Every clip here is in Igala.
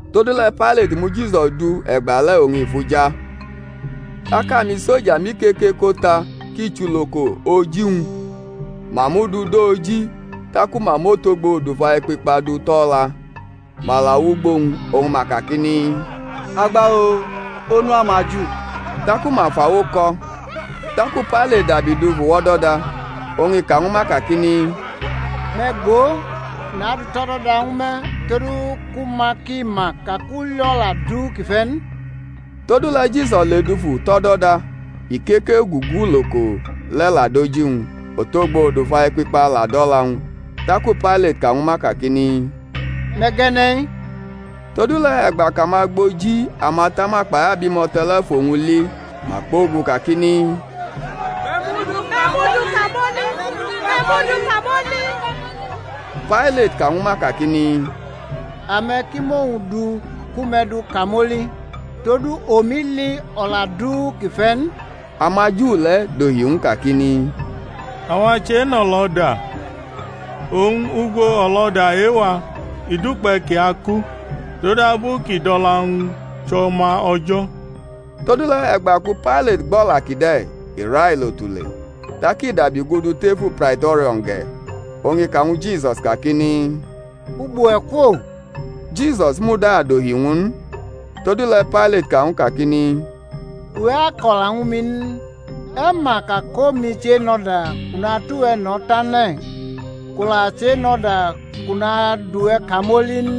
Todule̩ Pailati mu Jisus du e̩gbale̩ oñ i fʼu ja. Tak amisoja mʼikeke ko ta ki chʼuloko oji-wñ, ma mʼu du dʼo oji. Taku ma mʼotogbo odufa-ekpikpa du tʼo̩ o̩la, ma la wʼugbo wñ oñ ma kakini, Agba-o, Onu amaJu! Taku ma fʼawo kʼo̩. Taku Pailati dabi dufu wʼo̩do̩da, oñ i ka ñwu ma kakini, Me̩ go, nadʼu tʼo̩do̩da ñwu me̩ todu ku ma ki ma ka kʼu li o̩la du kʼi fe̩ n. Todule̩ Jisus ledufu tʼo̩do̩da, ikeke ugugu uloko le̩ la dʼoji-wñ, otogbo odufa-ekpikpa la dʼo̩la-wñ. Taku Pailati ka ñwu ma kakini, Me̩ gʼe̩ne̩-i! Todule̩ e̩gba kʼamagboji amatama kpai abimo̩to̩ le̩ fʼowñ li ma kpogu kakini, Me̩ mʼu du kamoli! me̩ mʼu du kamoli! Pailat ka ñwu ma kakini, Ame̩ ki mʼowñ du ku me̩ du kamoli, todu omi li o̩la du kʼi fe̩ n. AmaJu le̩ dohi ñw u kakini, Awa chenʼo̩lo̩da, oñ ugbo o̩lo̩da e-wa i dukpe̩ kʼi aku, todabu kʼi dʼo̩la-wñ chʼO̩ma O̩jo̩. Todule̩ e̩gba ku Pailati gbʼo̩la kide̩, i railo tule. Tak i dabi gudu tefu Praito̩rio̩n ge̩, oñ i ka ñwu Jisus kakini, Ugbo we̩ kwo? Jisus muda dohi ñw u n. Todule̩ Pailati ka ñw u kakini, Uwe̩ ako̩la ñwu mi n? E̩ ma ka kʼomi chenʼo̩da kʼu natʼuwe̩ no̩ tane̩ n, kʼu la chenʼo̩da kʼu nadʼuwe̩ kamoli n?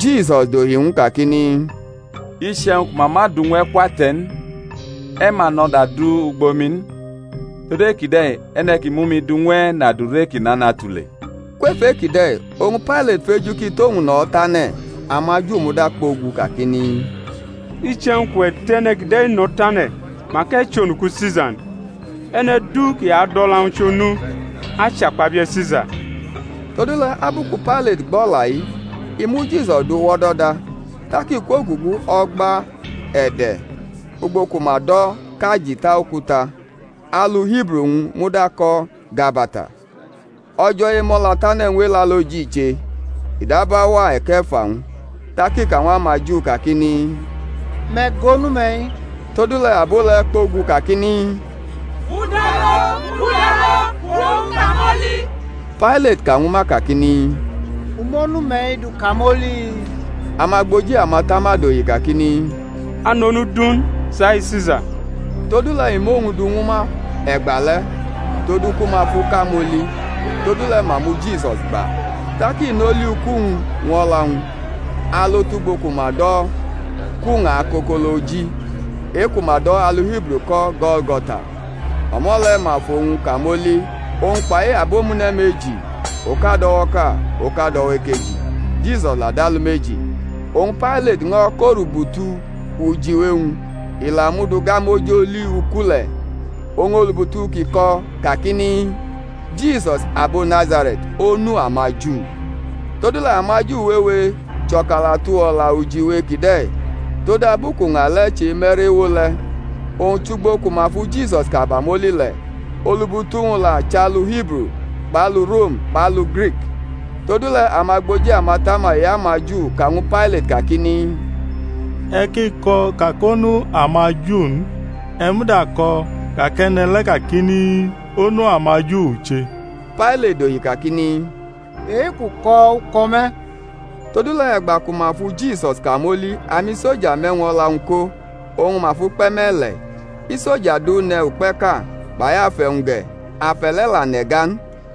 Jisus dohi ñw u kakini, Iche̩wñ ku ma ma du ñw e̩ kwʼate̩ n, e̩ ma nʼo̩da du ugbo mi n. Tod e-kide̩ e̩ne̩ ki mʼumi du ñw e̩ nʼadure ki nana tule. Kwef e-kide̩ oñ Pailati feju kʼi tʼowñ no̩ tane̩; amaJu muda kpogu kakini, Iche̩wñ kʼuwe̩ tʼe̩ne̩ kide̩ no̩ tane̩ mak e̩ chʼonuku Sisa n; e̩ne̩ du kʼi adʼo̩la-wñ chʼonu achʼakpabie̩ Sisa. Todule̩ abu ku Pailati gbʼo̩la-i i mu Jisus du wʼo̩do̩da, tak i kwogugu o̩gba-e̩de̩ ugbo ku ma do̩ kʼAjita-okuta, alu Hibru-wñ muda ko̩ Gabata. O̩jo̩ Emo̩latane̩ ñw Elaloji i che, i dab auwa e̩ke̩fa-wñ. Tak i ka ñw amaJu kakini, Me̩ go, Onu-me̩-i! Todule̩ abo le̩ kpogu kakini, Mʼu du alo, mʼu du alo, fʼowñ kamoli! Pailati ka ñwu ma kakini, U mʼOnu-me̩-i du kamoli? Amagboji amatama dohi kakini, A nʼonu du n, chai Sisa. Todule̩ i mʼowñ du ñwu ma e̩gba le̩, todu ku ma fʼu kamoli. Todule̩ ma mu Jisus gba. Tak i nʼoli uku-wñ ñw o̩la-wñ alo tʼugbo ku ma do̩ kʼuña Akokoloji, e-ku ma do̩ alu Hibru ko̩ Go̩lgo̩ta; o̩mo̩ le̩ ma fʼowñ kamoli, owñ kpai abomune̩ meji, oka dʼo̩wo̩ʼka, oka dʼo̩wo̩ ekeji, Jisus la dʼalumeji. Oñ Pailati ño̩ kʼorubutu ujiwe-wñ, i la mʼu du gamʼoj oli uku le̩. Oñ olubutu kʼi ko̩ kakini, JISUS ABO NAZARE̩T, ONU AMAJU. Todule̩ amaJu wewe chʼo̩kalatu o̩la ujiwe kide̩, todabu kʼuña le̩ cheme̩rʼewo le̩, owñ chʼugbo ku ma fu Jisus kamoli le̩; olubutu-wñ la chʼalu Hibru kpʼalu Rom kpʼalu Grik. Todule̩ amagboji amatama e-amaJu ka ñwu Pailati kakini, E̩ ki ko̩ ka kʼOnu amaJu n, e̩ muda ko̩ ka kʼe̩ne̩ le̩ kakini, Onu amaJu u che. Pailati dohi kakini, E-kʼu ko̩ u ko̩ me̩. Todule̩ e̩gba ku ma fu Jisus kamoli, amisoja mʼe̩wñ-o̩la-wñ ko, oñ ma fʼu kpe̩ me̩le̩, isoja du ne̩ ukpe̩ʼka; kpai afe̩-wñ ge̩; afe̩ le̩ la nʼe̩ga n,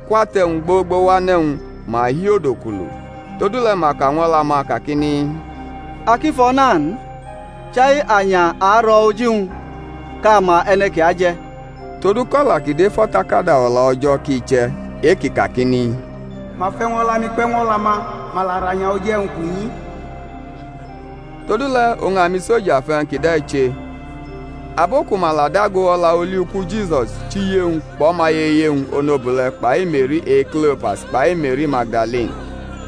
kwʼate̩-wñ gbogbo wʼane̩-wñ ma hi odukulu. Todule̩ ma ka ñw o̩la-ma kakini, A ki fʼo̩ na n, chai anya a aro̩ oji-wñ kʼa ma e̩ne̩ ki aje̩; todu kʼo̩la ki dʼef O̩takada O̩la O̩jo̩ ki che̩, e-ki kakini, Ma fʼe̩wñ-o̩la-mi kpe̩ ñw o̩la-ma, ma la rʼanya oji e̩wñ kʼu nyi. Todule̩ oñ amisoja fʼe̩wñ kide̩ che. Abo ku ma la dago o̩la oli uku Jisus chʼiye-wñ kpʼo̩maye iye-wñ onobule̩ kpai Me̩ri e-Klopas kpai Me̩ri Magdalini.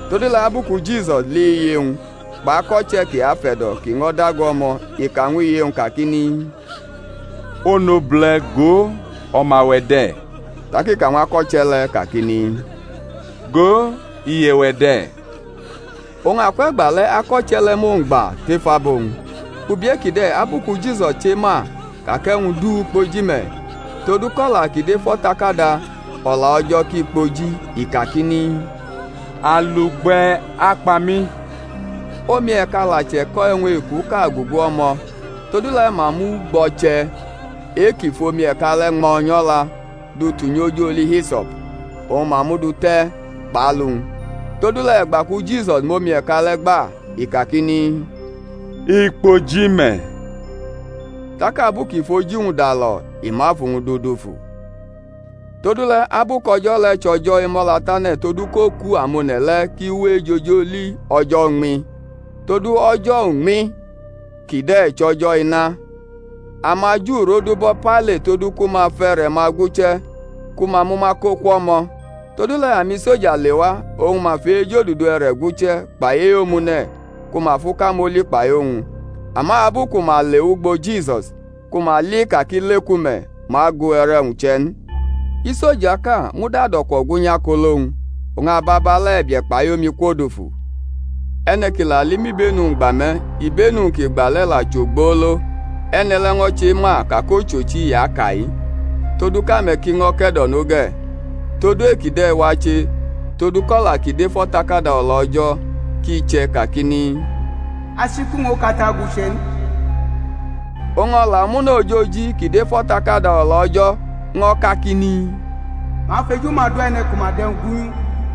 Todule̩ abu ku Jisus li iye-wñ, kpʼako̩che̩ kʼi afe̩do̩ kʼi ño̩ dago o̩mo̩, i ka ñw iye-wñ kakini, Onobule̩, go, o̩ma-we̩ de̩. Taki ka ñw ako̩che̩ le̩ kakini, Go, iye-we̩ de̩. Oñ akwʼe̩gba le̩ ako̩che̩ le̩ mʼowñ gba tef abo-wñ. Ubi e-kide̩, abu ku Jisus chema ka kʼe̩wñ du kpoji me̩, todu kʼo̩la ki dʼef O̩takada O̩la O̩jo̩ ki kpoji, i kakini, Alugbe̩ akpa mi. Omi e̩ka la che̩ko̩ e̩wñ ekuʼka gugu o̩mo̩, todule̩ ma mʼugbo̩che̩ e-ki fʼomi e̩ka le̩ ñmo̩ nyʼo̩la du tunyʼo̩j oli hiso̩p, oñ ma mʼu dute̩ kpʼalu-wñ. Todule̩ e̩gba ku Jisus mʼomi e̩ka le̩ gba, i kakini, I kpoji me̩; tak abu kʼi fʼoji-wñ dalo̩ i mʼafu-wñ du dufu. Todule̩, abu kʼo̩jo̩ le̩ chʼo̩jo̩ Emo̩latane̩, todu kʼoku amone̩ le̩ ki we ejʼoj oli o̩jo̩ uñmi, (todu o̩jo̩ uñmi kide̩ chʼo̩jo̩ ma), amaJu rodubo̩ Pailati todu ku ma fʼe̩re̩-ma guche̩, ku ma mʼuma ko kwʼo̩mo̩. Todule̩ amisoja lewa, oñ ma fʼe-ejodudu e̩re̩ guche̩, kpai e-omune̩ ku ma fʼu kamoli kpai owñ; ama abu ku ma le wʼugbo Jisus, ku ma li ka kʼi leku me̩, ma gu e̩re̩-wñ che̩ n. Iso̩jaʼka muda dʼo̩kwo̩ gwunyʼakolo-wñ, oñ ababale̩ e̩bie̩ kpai omi kwodufu. E̩ne̩ ki la li mʼibenu-wñ gba me̩, ibenu-wñ kʼi gba le̩ la chʼogbolo, e̩ne̩ le̩ ño̩ chema ka kʼochochi i aka-i, todu kʼame̩ ki ño̩ ke̩do̩no ge̩. Todu e-kide̩ wache todu kʼo̩la ki dʼef O̩takada O̩la O̩jo̩ ki che̩ kakini, Achiku-wñ okate aguche̩ n. Oñ o̩la omune̩ ojoji ki dʼef O̩takada O̩la O̩jo̩ ño̩ kakini, Ma afʼeju-ma do e̩ne̩ ku ma dʼe̩wñ gwunyʼu.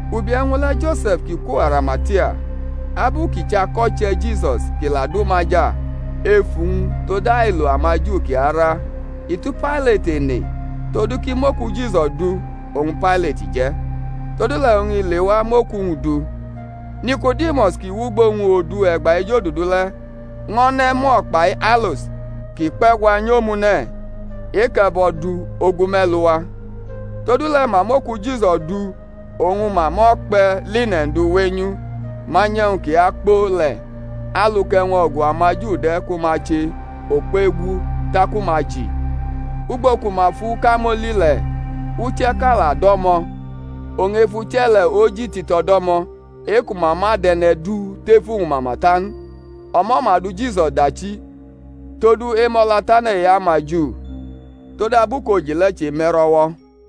Ubi e̩wñ le̩ Jose̩f kʼi kwo Arimatia, (abu kʼi chʼako̩che̩ Jisus kʼi la du maja ef uwñ tod ailo amaJu kʼi ara), i tu Pailati ene todu kʼi mʼoku Jisus du; oñ Pailati je̩. Todule̩ oñ i lewa mʼoku-wñ du. Niko̩dimus, kʼi wʼugbo wñ odu e̩gba ejodudu le̩, ño̩ ne̩ mur kpai alos ki kpe̩gwa nyʼomune̩ e-kʼe̩bo̩ du ogu me̩lu wa. Todule̩ ma mʼoku Jisus du oñ ma mʼo̩kpe̩ line̩n du wenyʼu manyʼe̩wñ ki akpo le̩, alu kʼe̩wñ-o̩gu amaJu de̩ ku ma che okuegu taku ma ji. Ugbo ku ma fʼu kamoli le̩ uche̩ʼka la do̩mo̩; oñ ef uche̩ le̩ oji tito̩ do̩mo̩, e-ku ma ma dʼe̩ne̩ du tʼef uwñ mama ta n. O̩mo̩ ma du Jisus dachi, tod Emo̩latane̩ e-amaju, todabu kʼoji le̩ cheme̩rʼo̩wo̩.